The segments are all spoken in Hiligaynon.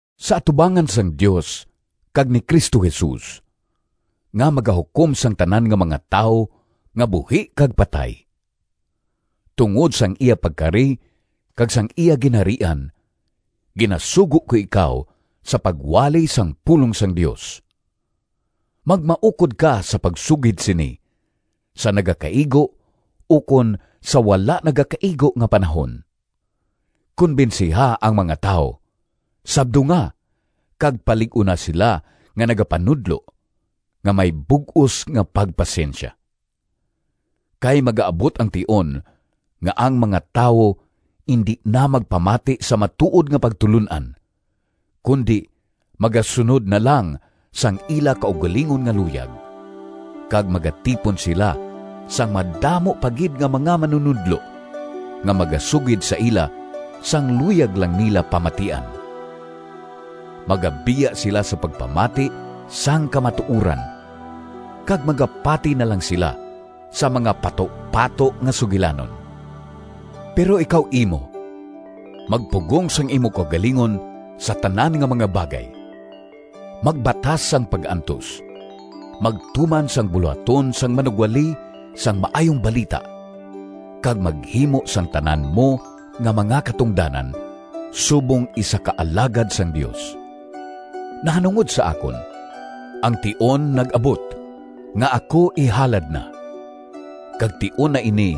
Sa atubangan sang Dios kag ni Cristo Jesus nga magahukom sang tanan nga mga tawo nga buhi kag patay, tungod sang iya pagkari kag sang iya Ginharian, ginasugo ko ikaw sa pagwali sang pulong sang Dios. Magmaukod ka sa pagsugid sini sa nagakaigo ukon sa wala nagakaigo nga panahon. Konbensiha ang mga tawo, sabdunga, kag palig-una sila nga nagapanudlo nga may bug-os nga pagpasensya. Kay magaabot ang tion nga ang mga tawo indi na magpamati sa matuod nga pagtulon-an, kundi magasunod na lang sang ila kaugalingon nga luyag, kag magatipon sila sang madamo pa gid nga mga manunodlo nga magasugid sa ila sang luyag lang nila pamatian. Magabiya sila sa pagpamati sang kamatuoran kag magapati na lang sila sa mga patupato nga sugilanon. Pero ikaw imo, magpugong sang imo kaugalingon sa tanan nga mga bagay, magbatas sang pag-antos, magtuman sang bulohaton sang manugwali sang Maayong Balita kag maghimo sang tanan mo nga mga katungdanan subong isa ka alagad sang Dios. Nahanungod sa akon, ang tion nag-abot nga ako ihalad na, kag tion na ini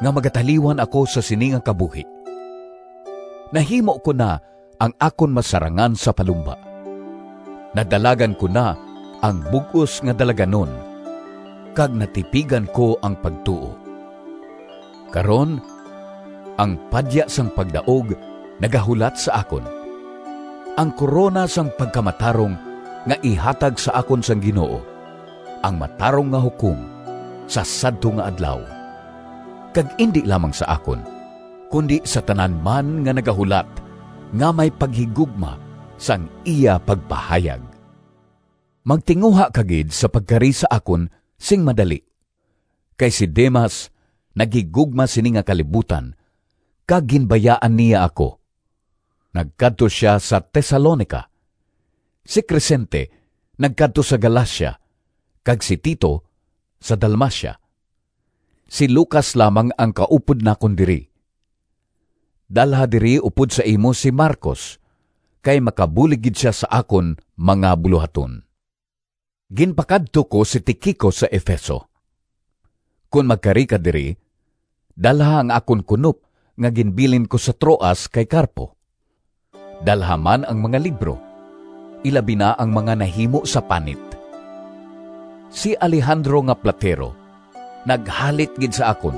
nga magataliwan ako sa sini nga kabuhi. Nahimo ko na ang akon masarangan sa palumba, nadalagan ko na ang bug-os nga dalaganon kag natipigan ko ang pagtuo. Karon, ang padya sang pagdaog nagahulat sa akon, ang korona sang pagkamatarong nga ihatag sa akon sang Ginoo, ang matarong nga Hukom, sa sadto nga Adlaw—kag indi lamang sa akon, kundi sa tanan man nga nagahulat nga may paghigugma sang iya pagpahayag. Magtinguha ka gid sa pagkari sa akon sing madali. Kay si Demas naghigugma sini nga kalibutan kag ginbayaan niya ako. Nagkadto sia sa Tesalonica. Si Crescente nagkadto sa Galacia kag si Tito sa Dalmacia. Si Lucas lamang ang kaupod nakon diri. Dalha diri upod sa imo si Marcos, kay makabulig gid sia sa akon mga bulohaton. Ginpakadto ko si Tiquico sa Efeso. Kon magkari ka diri, dalha ang akon kunop nga ginbilin ko sa Troas kay Carpo. Dalha man ang mga libro, ilabi na ang mga nahimo sa panit. Si Alejandro nga platero naghalit gid sa akon.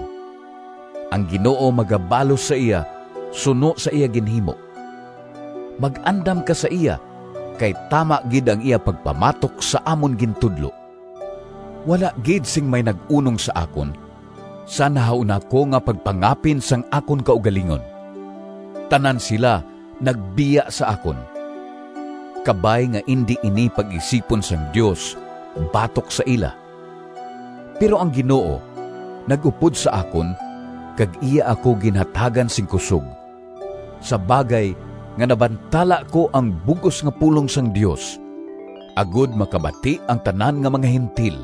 Ang Ginoo magabalos sa iya suno sa iya ginhimo. Mag-andam ka sa iya, kay tama gid ang iya pagpamatok sa amon gintudlo. Wala gid sing may nag-unong sa akon sa nahauna ko nga pagpangapin sang akon kaugalingon. Tanan sila nagbiya sa akon. Kabay nga indi ini pag-isipon sang Dios batok sa ila! Pero ang Ginoo nag-upod sa akon kag iya ako ginhatagan sing kusog, sa bagay nga nabantala ko ang bug-os nga pulong sang Dios agod makabati ang tanan nga mga Gentil,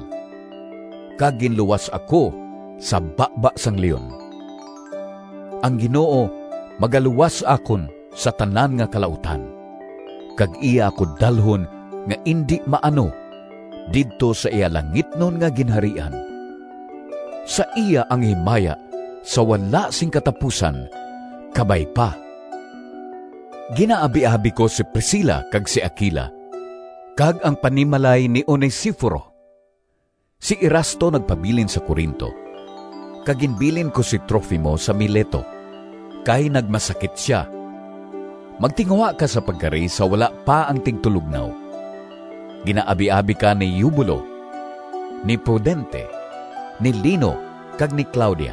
kag ginluwas ako sa baba sang leon. Ang Ginoo magaluwas sa akon sa tanan nga kalautan, kag iya ako dalhon nga indi maano didto sa iya langitnon nga Ginharian. Sa iya ang himaya sa wala sing katapusan! Kabay pa. Ginaabiabi ko si Priscila kag si Aquila kag ang panimalay ni Onesiforo. Si Erasto nagpabilin sa Corinto, kag ginbilin ko si Trofimo sa Mileto, kay nagmasakit sia. Magtinguha ka sa pagkari sa wala pa ang tigtulognaw. Ginaabiabi ka ni Eubulo, ni Pudente, ni Lino kag ni Claudia.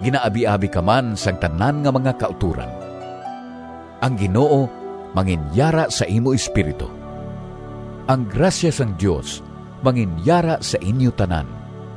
Ginaabiabi ka man sang tanan nga mga kautoran. Ang Ginoo manginyara sa imo espiritu. Ang grasya sang Dios manginyara sa inyo tanan.